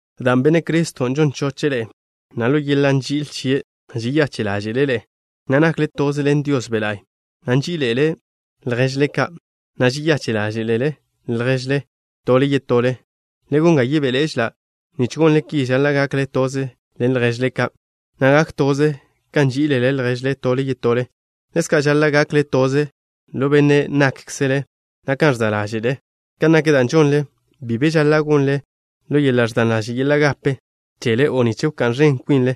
Dan' Benne' Criston' žon choche' ḻe'e, na' ḻo yeḻa' nži'il chie' žeyache' ḻáže'le' ḻe'e, na' nakle toze ḻen Dios Be' La'y, na' nží'ilele lježle ka', na' žeyache' ḻáže'lele lježle tole yetole, le gon ga yebéḻe'ežela'. Nich gonle ki, žaḻa' gakle toze ḻen lježle ka', na' gak toze kan nží'ilele lježle tole yetole. Ḻezka' žaḻa' gakle toze ḻo be' nákkzele, na' kan ẕza' ḻáže'le. Kan nak da' žonle, bi be žaḻa' gonle ḻo yeḻa' ẕdan yeḻa' gape chele o nich wká'n ẕen kwinle,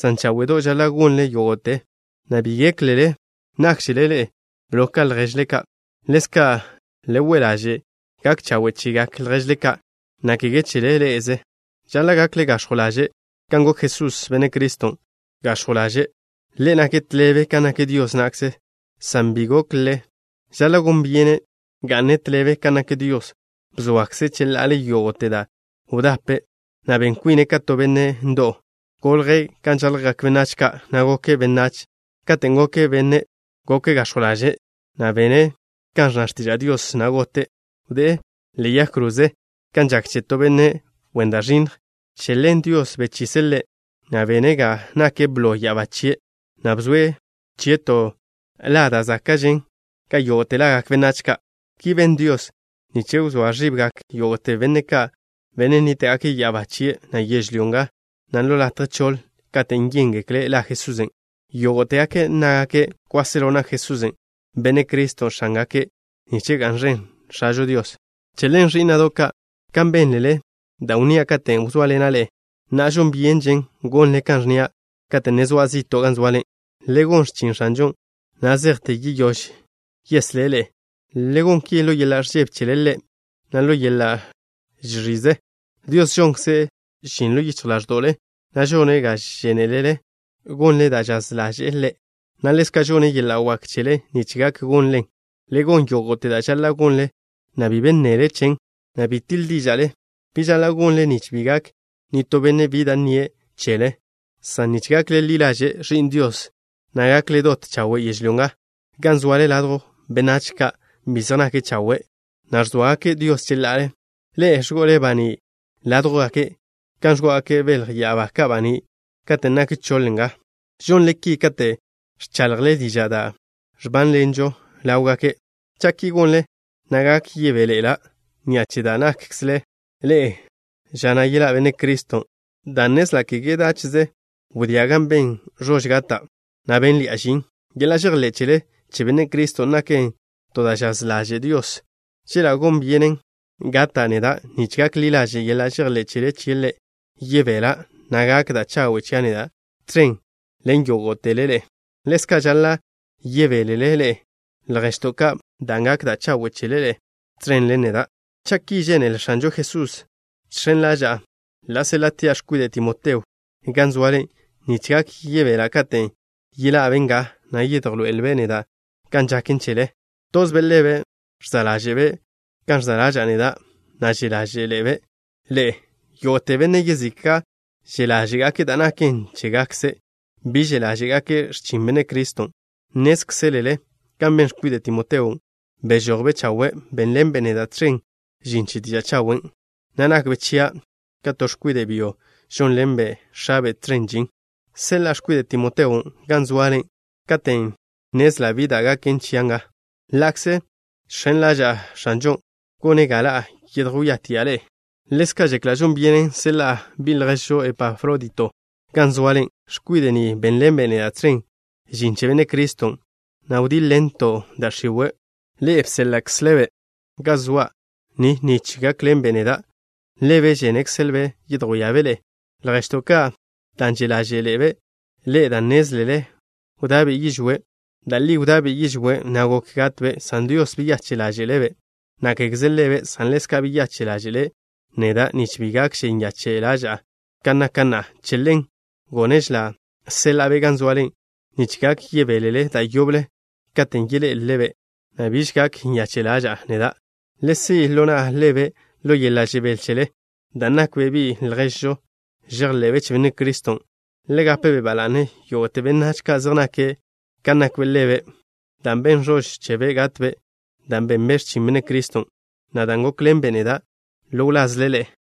san cháwe'do' žaḻa' gonle yógo'te, na' bi géklele nákžele ḻe'e blo ka lježle ka'. Ḻezka' le we' ḻaže' gak chawe' chegak lježle ka', na' kege chele ḻe'eze. Žaḻa' gakle gax̱jw ḻaže' kan gok Jesús, Benne' Criston', gax̱jw ḻaže'. Ḻe' nake' tḻebe kan nak Dios na'kze, san bi gokle' žaḻa' gon byene' ga'ne' tḻebe kan nak Dios. Bzoakze' cheḻa'ale yógo'te da' wdape', na' ben kwine' ka to benne' ndo'w. Golje' kan žaljgak benách ka', na' goke' benách. Katen' goke' benne', goke' gax̱jw ḻaže', na' bene' kan ẕnna x̱tiža' Dios, na' gote'. Wdé'e ḻe'e yag kroze kan žak che to benne' wen da' ẕinnj. Che ḻen Dios bechise' Ḻe', na' bene' ga nake' blo ya'abá chie', na' bzoe' chie' to la da' záka'žen ka yógo'te lagak benách ka'. Ki ben Dios nich wzóa ẕibgak yógo'te benne' ka', benne' nníta'gake' ya'abá chie', na' yežlyó nga, na' ḻo latje choḻ, katen' yéngekle' la Jesusen'. Yógo'tegake' nnágake' kwáselo nak Jesús, Benne' Criston', X̱ángake' nich ga'n ẕen X̱ažo Dios. Che ḻen, ẕí'na'do' ka', kan bénlele da' wnnía' katen' wzóaḻena' ḻe'e, na'a žon byenžen gonle kan ẕnnía' kate' ne zoa' zi'to' gan zoale. Le gon x̱chin X̱anžon' na' zejte yeyóž yeslé' ḻe'e. Le gon ki ḻo yeḻa' ẕžebe chele Ḻe', na' ḻo yeḻa' žẕize. Dios žonkze' žin ḻo yichj ḻáẕdo'le, na' žone' ga žénelele gonle da' žaz ḻaže'e Ḻe', na' ḻezka' žonne' yeḻa' wak chele nich gak gonlen. Le gon yógo'te da' žaḻa' gonle, na' bi be nnele chen, na' bi tiḻ díža'le. Ki žaḻa' gonle, nich bi gak nitó benne' bi da' nnie' chele, san nich gakle ḻi ḻaže' ẕi'n Dios, na' gakle dot chawe' yežlyó nga, gan zoale ladjw benách ka' bi zej nake' chawe', na' ẕzóagake' Dios cheḻa'ale. Ḻe'e ẕgo'le baní' ládwjgake' kan ẕgo'ogak belj ya'abá ka' baní' katen' nak choḻ nga. Žonle ki kate' ẕchaḻjle diža' da' ẕbánḻenžo ḻáwgake'. Cha' ki gonle, na' gak yebéḻe'ela' ni'a che da' nákkzele ḻe'e ža na' yeḻá' Benne' Criston', dan' nnezla' kege dáche'ze wdía' gan ben ẕož gata', na' bénḻi'a žin. Yeḻa' žejḻé' chele che Benne' Criston' naken to da' žaz ḻaže' Dios. Cheḻa' gon byenen gata' neda' nich gak ḻi ḻaže' yeḻa' žejḻé' chele chie' Ḻe', yebela', na' gak da' chawe' chia' neda' tẕen ḻen yógo'tele ḻe'e. Ḻezka' žaḻa' yebélele ḻe'e, lježto' ka', dan' gak da' chawe' chele ḻe'e tẕen ḻen neda'. Cha' ki žénele X̱anžo Jesusen', žx̱en ḻaža'a ḻa' séḻa'tia' x̱kwide' Timoteo gan zoale, nich gak yebela' katen' yeḻa'be' nga, na' yedjloé'elbe' neda' kan žaken chele. Tozbe' ḻebe' ẕza' ḻáže'be' kan ẕza' ḻaža'a neda', na' že' ḻáže'ḻe'ebe' ḻe'e. Yógo'te benne' yezika' že' ḻáže'gake' da' naken chégakze'. Bi že' ḻáže'gake' x̱chin Benne' Criston'. Nnézkzelele kan ben x̱kwide' Timoteon', bežojbe' chawe'. Bénḻenbe' neda' tẕen žin che diža' chawen', na' nakbe' chia' ka to x̱kwide' byo, žónḻenbe' x̱abe' tẕen žin. Seḻa'a x̱kwide' Timoteon' gan zoale katen' nnezla' bi da' gaken chia' nga, ḻa'kze žx̱en ḻaža'a X̱anžon' gone' ga ḻa' yedjwíatia' ḻe'e. Ḻezka' žekla' žon byenen seḻa'a bi' lježžo Epafrodito gan zoale. X̱kwide' ni bénḻenbe' neda' tẕen žin che Benne' Criston', na' wdíḻ-ḻento' da' x̱iwe'. Ḻe'e bséḻa'kzele-be' ga zoa' ni nich gákḻenbe' neda'. Ḻebe' žénekzelbe' yedjwíabe' ḻe'e, lježto' ka', dan' že' ḻáže'ḻe'ebe' ḻe'e dan' nnézlele wda'be' yižwé'. Da' li wda'be' yižwé', na' gok gatbe', san Dios beyache' ḻáže'le'-be', na' kégeze ḻebe', san ḻezka' beyache' ḻáže'le' neda', nich bi gakže nyache' ḻaža'a ka naka' na'a. Che ḻen, gónežela' seḻa'a-be' gan zoale nich gak yebélele da' yoble katen' yeḻé'elele-be', na' biž gak nyache' ḻaža'a neda'. Le si' ḻo na'le-be' ḻo yeḻa' žebél chele, dan' nakbe' bi' lježžo žejḻe'be' che Benne' Criston'. Le gape ba la'ne yógo'te benách ka' zej nake' kan nakbe' ḻebe', dan' ben ẕož chebe' gatbe' dan' benbe' x̱chin Benne' Criston', na' dan' gókḻenbe' neda' ḻo wlazle ḻe'e.